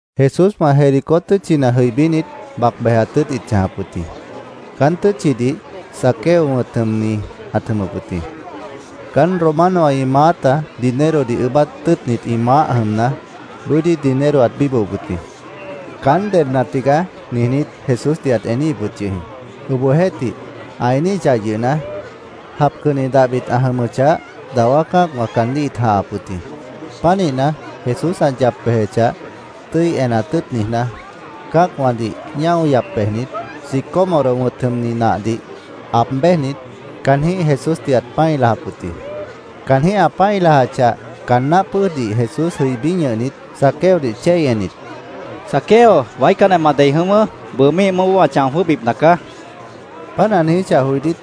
Jesúswã Jericó tʉ́tchina jʉibínit, bac bejat tʉ́ʉt ĩt chãjap wʉt jĩ. Caán tʉ́tchidih Zaqueo wʉ̃t jʉmni ãt jʉmʉp wʉt jĩ. Caán Romanowã ĩ maáta dinerodih ʉʉ́bát tʉ́ʉtnit ĩ maáh jʉmna, bʉ́dí dinero ãt bíbohop wʉt jĩ. “Caán dedna tigaá”, niijnít, Jesúsdih ãt eníhip wʉt yʉh jĩ. Obohjeéhtih, ã eníhichah yʉhna, japcanni dahbit ã jʉmʉchah, dawá cã́acwã caandíh ĩt jãhap wʉt jĩ. Pánihna, Jesús ã yap bejechah, tʉ́i enat tʉ́ʉt niijná, cã́acwãdih ñáo yap bejnit, sicómoro wʉ̃t jʉmni nahdih aab béjnit, caanjĩ́h Jesúsdih ãt pã́i lajap wʉt jĩ. Caanjĩ́h ã pã́i lajachah, caan náh pʉ́ʉjdih Jesús jʉibí ñʉhnit, Zaqueodih chéi ennit, —¡Zaqueo, waícanjeh ma dei jʉ̃ʉ́wʉ́! Bʉʉ míih mʉʉ́boó wã chão jwʉ́hbipna caá, Jesús caandíh ãt niijíp wʉt jĩ.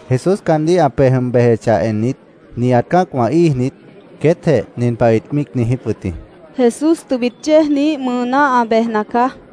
Jesús caandíh ã pej jʉm bejechah ennit, nihat cã́acwã íijnit, queétjeh nin pah ĩt míic niijíp wʉt jĩ: —Jesús tʉbit yéejniíh mʉʉná ã bejna caá, ĩt niijíp wʉt jĩ.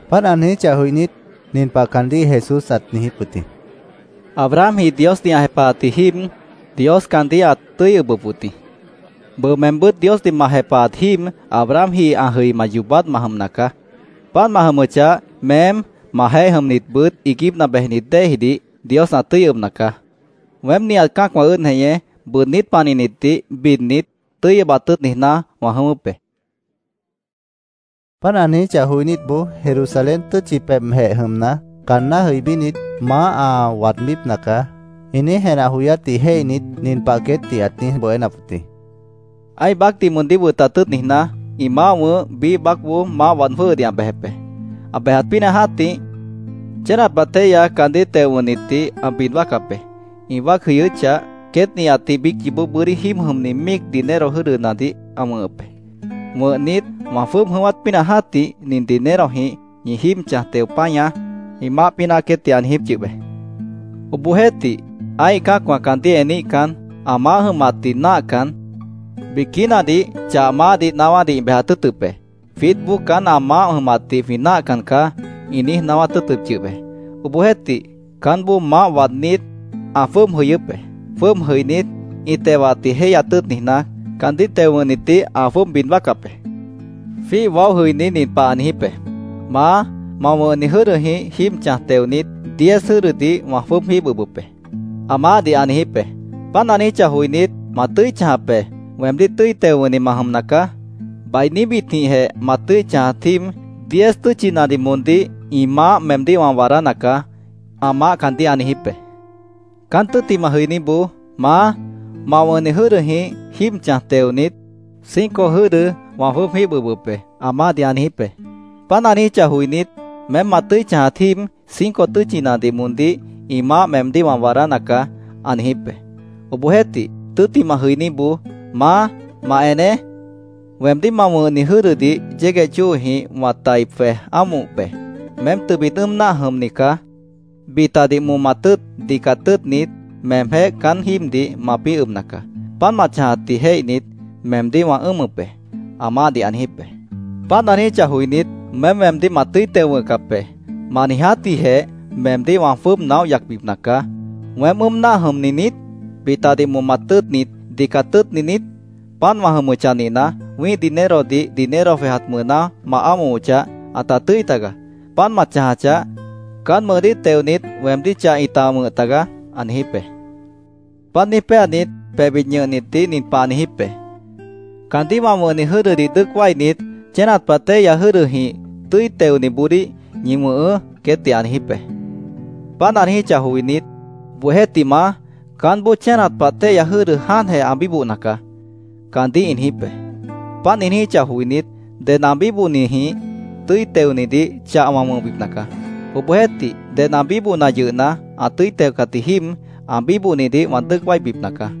Páant ã niijíchah joinít, nin pah caandíh Jesús ãt niijíp wʉt jĩ: —Abrahamji Diosdih ã jepahat jíib, Dios caandíh ãt tʉ́i ʉbʉp wʉt jĩ. Bʉʉ meembʉ́t Diosdih ma jepahat jíib, Abrahamji ã jʉima yoobát ma jʉmna caá. Páant ma jʉmʉchah, meém, majeéh jʉmnitbʉt iiguípna bejnit déejidih Dios ã tʉ́i ʉbna caá. Weém nihat cã́acwã ʉ́ʉd jeñé, bʉʉdnít panihnitdih bidnit, tʉ́i ʉbat tʉ́ʉt niijná, wã jʉ̃ʉ́wʉ́p be, Jesús ãt niijíp wʉt jĩ. Páant ã niijíchah joinítboó Jerusalén tʉ́tchi pebhjeh jʉmna, caanná jʉibínit, “Maáh ã waadbípna nacaá”, ĩ niíj jenah joyátdih jéihnit, nin pah queétdih ãt niíj bohénap wʉt jĩ: “Ã́ih baácdih moondíh wʉtat tʉ́ʉt niijná, ĩ maáh wʉ̃ʉ́h biíh baácboó maáh waad jwʉ́hʉdih ã bejep be. Ã bejat pínah jã́tih, chénat pah téihya caandíh teo wʉ̃hnitdih ã bid wáacap be. Ĩ wáac jʉyʉ́chah, queét nihatdih biíc yoobó bʉ́dí jíib jʉmni míic dinero jʉ́dʉnadih ã wʉ̃hʉp be. Wʉ̃hnit, ‘Wã jwʉ́ʉb jʉ̃ʉ́wát pínah jã́tih, nin dinerojĩh ñi jíib chãj teo páñaá’, ĩ maáh pínah queétdih ã niijíp yʉh be. Obohjeéhtih, ã́ih cã́acwã caandíh eníhcan, ã maáh jʉmatdih náahcan, biquínadih chah maáhdih naáwádih ĩ bejat tʉ́ʉtʉp be. ‘Jwiítboó caán ã maáh jʉmatdih jwĩ náahcan caá’, ĩ niíj naáwát tʉ́ʉtʉp yʉh be. “Obohjeéhtih, caánboó maáh waadnít, ã jwʉ́ʉb jʉyʉ́p be. Jwʉ́ʉb jʉinít, ĩ tewatdih jéihyat tʉ́ʉt niijná, caandíh teo wʉ̃hnitdih ã jwʉ́ʉb bid wáacap be. Jwíih waóh jʉiní nin pah ã niijíp be, ‘Maá, ma wʉ̃hni jʉ́dʉjĩh jíib chãj teonit, diez jʉ́dʉdih wã jwʉ́ʉb jíib ʉbʉp be’, ã maáhdih ã niijíp be. Páant ã niijíchah joinít, ‘Ma tʉ́i chãjap be. Weemdíh tʉ́i teo wʉ̃hni ma jʉmna caá. Bainíbitjĩhjeh ma tʉ́i chãjat jíib, diez tʉ́tchinadih moondíh ĩ maáh meemdíh wã waadána caá’, ã maáh caandíh ã niijíp be. Caán tʉ́ttimah jʉiníboó ‘Maá, ma wʉ̃hni jʉ́dʉjĩh jíib chãj teonit, cinco jʉ́dʉdih wã jwʉ́ʉb jíib ʉbʉp be’, ã maáhdih ã niijíp be. Páant ã niijíchah joinít, ‘Meém ma tʉ́i chãjat jíib, cinco tʉ́tchinadih moondíh ĩ maáh meemdíh wã waadána caá’, ã niijíp be. “Obohjeéhtih, tʉ́ttimah jʉiníboó ‘Maá, ma eneé. Weemdíh ma wʉ̃hni jʉ́dʉdih yégueh chóojĩh wã tʉ́i tai jwej ámohop be. Meém tʉbit ʉ́ʉm náah jʉmni caá. Bitadih momat tʉ́ʉt, dicat tʉ́ʉtnit, meemjéh caán jíibdih mapĩ́ ʉbna caá. Páant ma chãjatdih jéihnit, meemdíh wã ʉ́ʉmʉp be’, ã maáhdih ã niijíp be. Páant ã niijíchah joinít, ‘Meém weemdíh ma tʉ́i teo wʉ̃hcap be. Ma niijátjĩhjeh meemdíh wã jwʉ́ʉb naóh yacbipna caá. ¿Weém ʉ́ʉm náah jʉmni niít? ¿Bitadih momat tʉ́ʉtni, dicat tʉ́ʉtni niít? Páant wã jʉmʉchah nihna, wĩ́ih dinerodih dinero jwejat mʉʉná ma ámohochah, ãta tʉ́i tagaá. Páant ma chãjachah, caán mʉʉdíh teonit weemdíh chah ĩta wʉ̃h tagaá’, ã niijíp be. Páant niíj péanit, pebhbit ñʉhnitdih nin pah ã niijíp be: ‘Caandíh wã wʉ̃hni jʉ́dʉdih dʉ́ʉc wáinit, chénat pah téihya jʉ́dʉjĩh tʉ́i teoniboodíh ñi wʉ̃hʉʉ́’, queétdih ã niijíp be. Páant ã niijíchah joinít, ‘¡Obohjeéhtih, Maá, caánboó chénat pah téihya jʉ́dʉ jáantjeh ã bíbohna caá!’ caandíh ĩ niijíp be. Páant ĩ niijíchah joinít, ‘Ded ã bíbohnijĩh tʉ́i teonidih chah wã wʉ̃hbipna caá. Obohjeéhtih, ded ã bíbohna yʉhna, ã tʉ́i teocat jíib, ã bíbohnidih wã dʉ́ʉc wáibipna caá.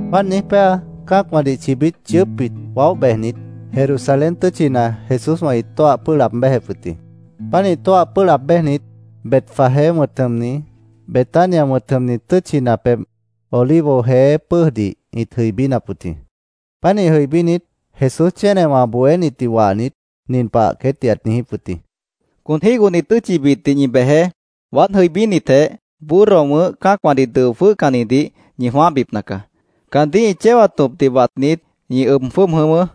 Páant niíj péa, cã́acwãdih chibít yʉʉ́pbit waóh bejnit, Jerusalén tʉ́tchina Jesúswã ĩt tóah pʉ́ʉh laab béjep wʉt jĩ. Pánih tóah pʉ́ʉh laab béjnit, Betfagé wʉ̃t jʉmni, Betania wʉ̃t jʉmni tʉ́tchina pebh, Olivo Jeé pʉ́ʉjdih ĩt jʉibínap wʉt jĩ. Pánih jʉibínit, Jesús chénewã ã bohénitdih wahnit, nin pah queétdih ãt niijíp wʉt jĩ: —Con jígohni tʉ́tchibitdih ñi bejeé. Waád jʉibínitjeh, burro wʉ̃ʉ́h cã́acwãdih dʉo jwʉ́hcannidih ñi jwãáhbipna caá. Caandíh ĩ chéwat tõpdih watnit, ñi ʉb jwʉ́ʉb jʉ̃ʉ́wʉ́.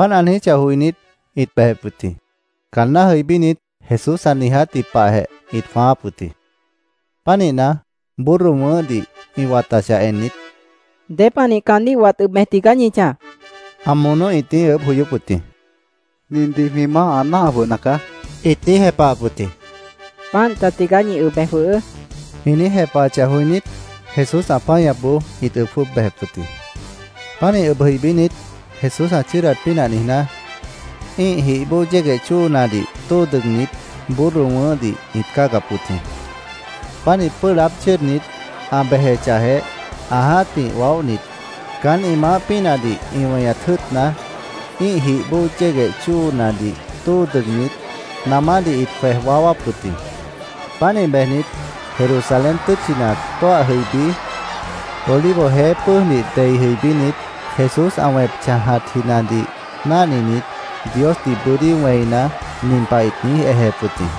Páant ã niijíchah joinít, ĩt bejep wʉt jĩ. Caanná jʉibínit, Jesús ã niijátji pahjeh ĩt jwãááp wʉt jĩ. Pánihna, burro wʉ̃ʉ́hdih ĩ watachah ennit, —¿Dépanih caandíh wat ʉb bej tigaá ñi chãj? ã monó ĩt niíj ʉʉ́bh joyóp wʉt jĩ. —Nindih jwĩ Maáh ã náah jwʉhna caá, ĩt niíj jepahap wʉt jĩ. —Páant ta tigaá. Ñi ʉb bej jwʉhʉʉ́, ĩ niíj jepahachah joinít, Jesús ã páñapboó ĩt ʉb jwʉ́ʉb bejep wʉt jĩ. Pánih ʉb jʉibínit, Jesús ã chʉ́ʉdat pínah niijná, ĩ́ih jih bóo yégueh chóonadih tóo dʉgnit, burro wʉ̃ʉ́hdih ĩt cáagap wʉt jĩ. Pánih pʉ́ʉh laáb chʉ́ʉdnit, ã bejechahjeh, ã jã́tih waóhnit, caán ĩ maáh pínahdih ĩ weñat jʉ́ʉtna, ĩ́ih jih bóo yégueh chóonadih tóo dʉgnit, namádih ĩt jwej waáwáp wʉt jĩ. Pánih bejnit, Jerusalén tʉ́tchina tóah jʉibí, Olivo Jeé pʉ́ʉjdih dei jʉibínit, Jesús ã wẽp chãjatjinadih náhninit, Diosdih bʉ́dí wẽina, nin pah ĩt niíj ejep wʉt jĩ: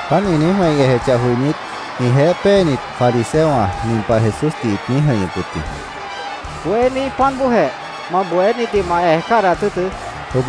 Páant ĩ niíj wẽi ejechah joinít, ĩjeéh péenit fariseowã nin pah Jesúsdih ĩt niíj jʉ̃ihñʉp wʉt jĩ: —¡Bohéní, páant bóojeh! Ma bohénitdih ma ej cádahat tʉ́ʉtʉ́, ĩt niijíp wʉt yʉh jĩ.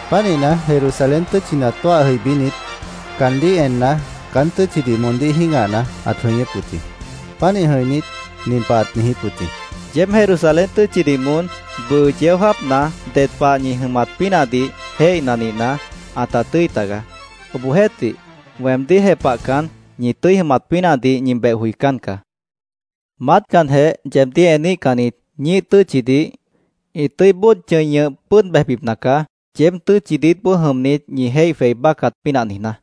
Pánihna, Jerusalén tʉ́tchina tóah jʉibínit, caandíh enna, caán tʉ́tchidih moondíh jĩ́gahna, ãt jʉñʉ́p wʉt jĩ. Pánih jʉ̃inít, nin pah ãt niijíp wʉt jĩ: “Yeéb Jerusalén tʉ́tchidih moón bʉʉ yeó jáapna ded pah ñi tʉ́i jʉmat pínahdih jéihna nihna, ãta tʉ́i tagaá. Obohjeéhtih, weemdíh jepahcan, ñi tʉ́i jʉmat pínahdih ñi beh joicán caá. Maátcanjeh yeebdíh eníhcannit ñíih tʉ́tchidih ĩ tʉ́i bóod chʉ̃i ñʉh pʉ́ʉd bejbipna caá, yeéb tʉ́tchi diítboó jʉmnit ñi jéih jwei báccat pínah niijná.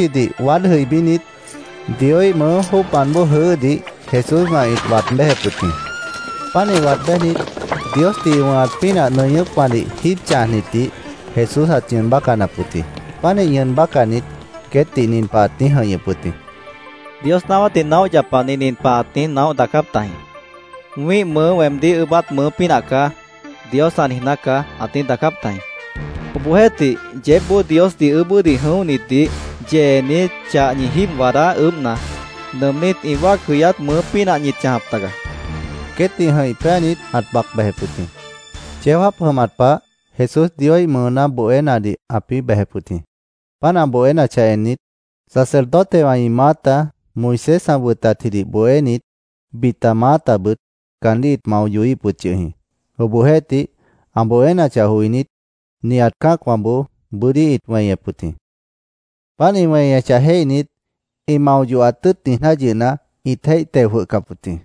Jerusalén tʉ́tchidih waád jʉibínit, Dioíh mʉʉ́ jóocmant bóo jʉʉ́hdih Jesúswã ĩt waad béjep wʉt jĩ. Pánih waad béjnit, Diosdih ĩ wʉ̃hat pínah nʉñʉ́pwãdih jíib chãjnitdih Jesús ãt ñʉʉn bácanap wʉt jĩ. Pánih ñʉʉn bácanit, queétdih nin pah ãt niíj jʉ̃ihñʉp wʉt jĩ: —Dios naáwátdih naóh yapani nin pah ãt niíj naóh daacáp tajĩ: ‘Wĩ́ih mʉʉ́ weemdíh ʉʉ́bát mʉʉ́ pínah caá’, Dios ã niijná caá,ãt niíj daacáp tajĩ. Obohjeéhtih, yeébboó Diosdih ʉʉ́bʉ́dih jʉ̃óhnitdih yeenit, chah ñi jíib waadá ʉʉ́bhna, nʉʉmnít ĩ wáac jʉyát mʉʉ́ pínah ñit chãjap taga, ãt niijíp wʉt jĩ. Queétdih jʉ̃ih péanit, ãt bac bejep wʉt jĩ. Yeó jáap jʉmat pah Jesús Dioíh mʉʉná bohénadih ãpĩ́ bejep wʉt jĩ. Páant ã bohénachah ennit, sacerdotewã ĩ maáta, Moisés ã wʉtatjidih bohénit, bita maátabʉt caandíh ĩt mao yohíhip wʉt yʉh jĩ. Obohjeéhtih, ã bohénachah joinít, nihat cã́acwãboó bʉ́dí ĩt weñep wʉt jĩ. Páant ĩ weñechah jéihnit, ĩ mao yohat tʉ́ʉt niijná yʉhna, ĩt jéih teo jwʉhcap wʉt jĩ.